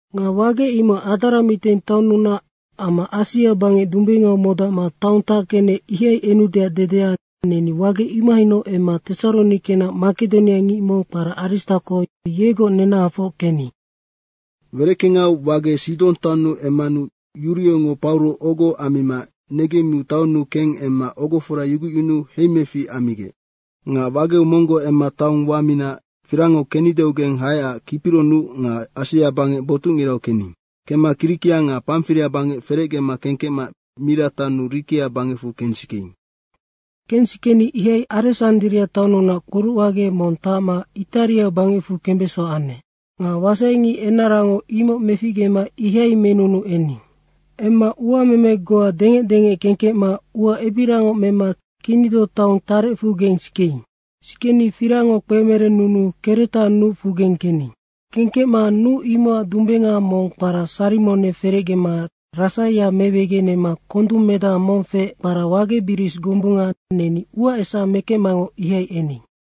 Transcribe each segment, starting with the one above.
Nga wage imoc Adramiteng taonnunac amma Asia bangec dumbengau modacma taong tackenec, ihai enudeac dedea, neni wage imohainoc emma Tesaronikenac makedoniangic mong kpara Aristako, yegoc nenahafoc kening. Wereckengau wage Sidong taonnu emmanu Yuriongo Pauro ogo ammima negemmiu taonnu keng emma ogofora yugucyunuu heimefic ammigec. Nga wageu monggoc emma taong wamina firangngo kennideugeng haecac Kipiro nuc nga Asia bangec botucngirau kening. Kemma Kirikia nga Pamfiria bangec ferecgema kengkecma Mira taonnu Rikia bangecfu kensikeing. Kensikeni ihai Aresandria taonnunac kporucwage mong tacma Itaria bangecfu kembeso anec. Nga wasaingic enarango imoc meficgema ihai menunuu ening. Emma uameme goa dengec dengec kengkecma ua ebiriangoc mema Kinido taong tarecfugeng sikeing. Sikeni firangngo kpemerennunuu Kreta nucfugeng kening. Kengkecma nuc imocac dumbenga mong kpara Sarimone ferecgema Rasaia mewegenema kondung medaha mong feec, kpara Wage bris gombunga, neni uaesa mekecmangoc ihai ening.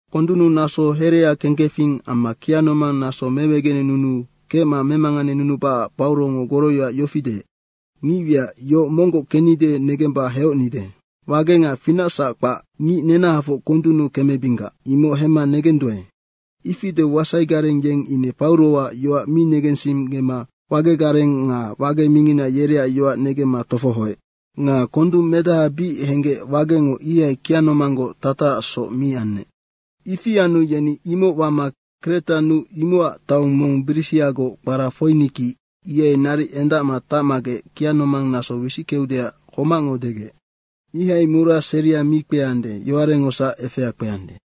Kondunnu naso herea kengkefing amma kianomang naso mewegenenunu kecma memanganenunubacac Paurongo goroyoac yofi deec, “Ngicwiac, yoc monggoc kennide negemba heocnenide. Wage nga finacsac kpac, ngic nenahafoc kondunnu kemebinggac.” imoc hemma negenduae. Ifi edeu wasaigareng yeng ine Pauroac yoac mi negensinggema wagegareng nga wage mingina yereac yoac negemma tofohoec. Nga kondung medaha bic henggec wagengo ihai kianomanggoc tatacacsoc mi anec. Ifi anu yeni imoc wama Kreta nuc imocac taong mong brisiagoc kpara Foiniki, ihai naric endacma tacmagec kianomang naso wisickeudeac homacngo degec. Ihai mura seria mi kpeande, yowarecngosac efea kpeande.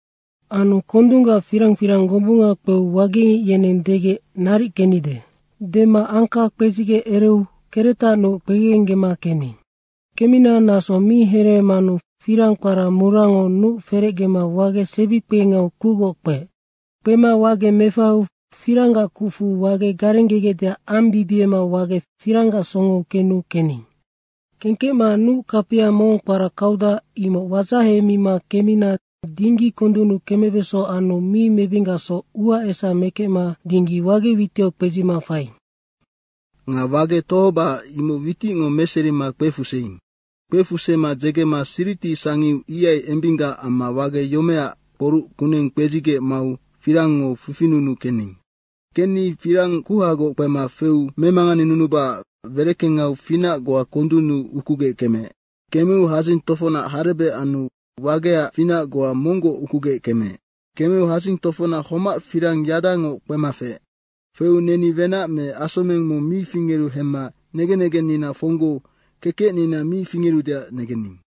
Anu kondunggac firang firang gombunga kpeu wagengic yeneng degec, “Naric kennide.” dema angka kpedzigec ereu Kreta nuc kpegegenggema kening. Kemmina naso mi hereemanu firang kpara murango nuc ferecgema wage sebikpengau kucgoc kpeec. Kpema wage mefaheu firanggac kucfu wage garenggegecdeac ambibiema wagec firanggac songou kenu kening. Kengkecma nuc kapia mong kpara Kauda, imoc wadzahemima kemmina dinggi kondunnu kemebeso anu mi mebinggacsoc uaesa mekecma dinggi wage witiau kpedzima faiing. Nga wage tohobacac imoc witicngo meserima kpefuseing. Kpefusema dzegema Siriti sangiu, ihai embinggac amma wage yomeaac kporuc kuneng kpedzigec mau firangngo fifinunuu kening. Kenni firang kuhagoc kpema feu memanganenunubacac wereckengau finac goa kondunnu ukugec kemeec. Kemeu hadzing tofocnac harebec anu wageac finac goa monggoc ukugec kemeec. Kemeu hadzing tofocnac homac firang yadango kpema feec. Feu neni wenac me asomeng mong mi fingeru hemma negen negennina fonggou kekecnina mi fingerudeac negening.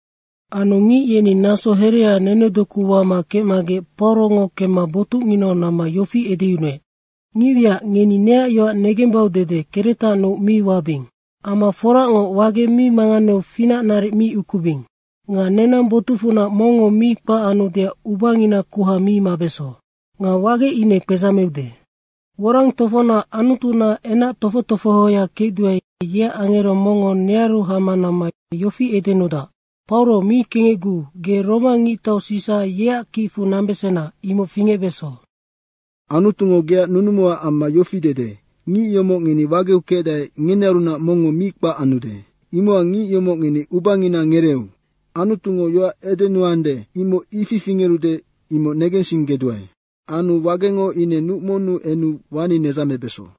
Anu ngic yeni naso herea nenedoku wama kecmagec Paurongo kemma botucnginau namma yofi edeyunuec, “Ngicwiac, ngeni neac yoac negembau dede Kreta nuc mi wabing. Amma forangoc, wage mi manganeu finac naric mi ukubing. Nga nenang botucfunac mongngo mi kpac anudeac ubangina kuha mi mabeso. Nga wage ine kpedzameude. Worang tofocnac Anutunaac enac tofoc tofohoya kecduae, yeac angero mongngo nearu hama namma yofi edenudac, ‘Pauro, mi kengecguu, ge Roma ngictau Sisa yeac kicfu nambesena, imoc fingecbeso. Anutungo geac nunumuac amma yofi dede, “Ngic yomoc ngeni wageu kecdae, ngenearunac mongngo mi kpac anude.” ’ Imocac ngic yomoc ngeni ubangina ngereeu. Anutungo yoac edenuande, imoc ifi fingerude, imoc negensinggeduae. Anu wagengo ine nuc monnu enu wani nedzamebeso.”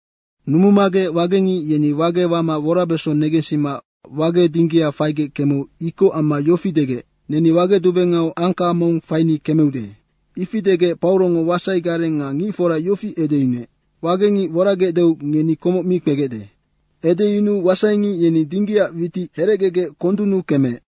Numumagec wagengic yeni wage wama worabeso negensima wage dinggia faigec kemeu ikoc amma yofi degec, “Neni wage dumbengau angka mong faini kemeude.” Ifi degec Paurongo wasaigareng nga ngicfora yofi edeyunuec, “Wagengic woragecdeu ngeni komoc mi kpegecde.” Edeyunuu wasaingic yeni dinggiac witic herecgegec kondunnu kemeec.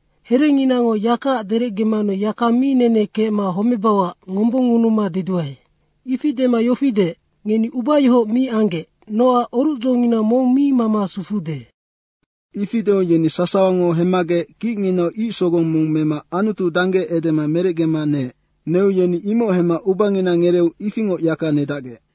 Herenginango yakaac derecgemanu yaka mi nene kecma homebauac ngombongngunuma deduae.” Ifi dema yofi deec, “Ngeni ubayohoc mi anggec nocac orucdzongina mong mi mama sufuude.” Ifi deu yeni sasawango hemmagec kicnginau ic sogong mong mema Anutu dangge edema merecgema neec. Neu yeni imoc hemma ubangina ngereeu ifingoc yaka nedacgec.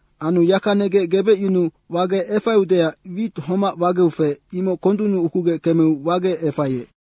Anu yaka negec gebecyunuu wage efaiudeac wit homac wageu feec, imoc kondunnu ukugec kemeu wage efaiec.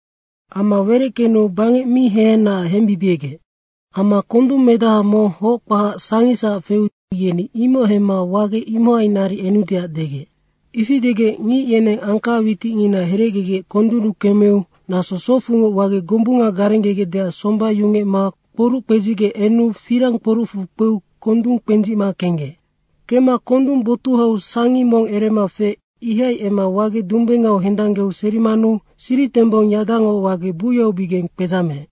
Ama wereckenu bangec mi hehenaac hembibiegec. Amma kondung medaha mong hoc kpahac sangisac feu yeni imoc hemma wage imohai naric enudeac degec. Ifi degec ngic yeneng angka witicngina herecgegec kondunnu kemeu naso socfungoc wage gombunga garenggegecdeac somba yungecma kporuc kpedzigec enu firang kporucfu kpeu kondung kpendzicma kenggec. Kemma kondung botuhau sangi mong erema feec, ihai emma wage dumbengau hendanggeu serimanu siritembong yadango wage buyaubigeng kpedzameec.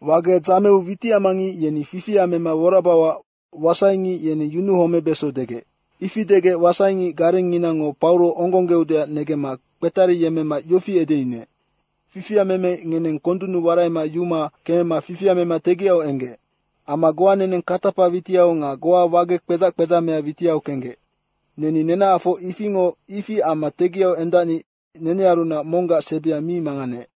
Wage dzameu witicamangic yeni fifia mema worabauac wasaingic yeneng yunuhomebeso degec. Ifi degec wasaingic garengnginango Pauro onggongeudeac negemma kpetariyemmema yofi edeyunuec, “Fifia meme ngeneng kondunnu waraima yuma kemema fifia mema tegiau enggec. Amma goa neneng katapa witiau nga goa wage kpedzac kpedzamea witiau kenggec.” Neni nenahafoc ifingo ifi amma tegiau endacni nenearunac monggac sebia mi manganeec.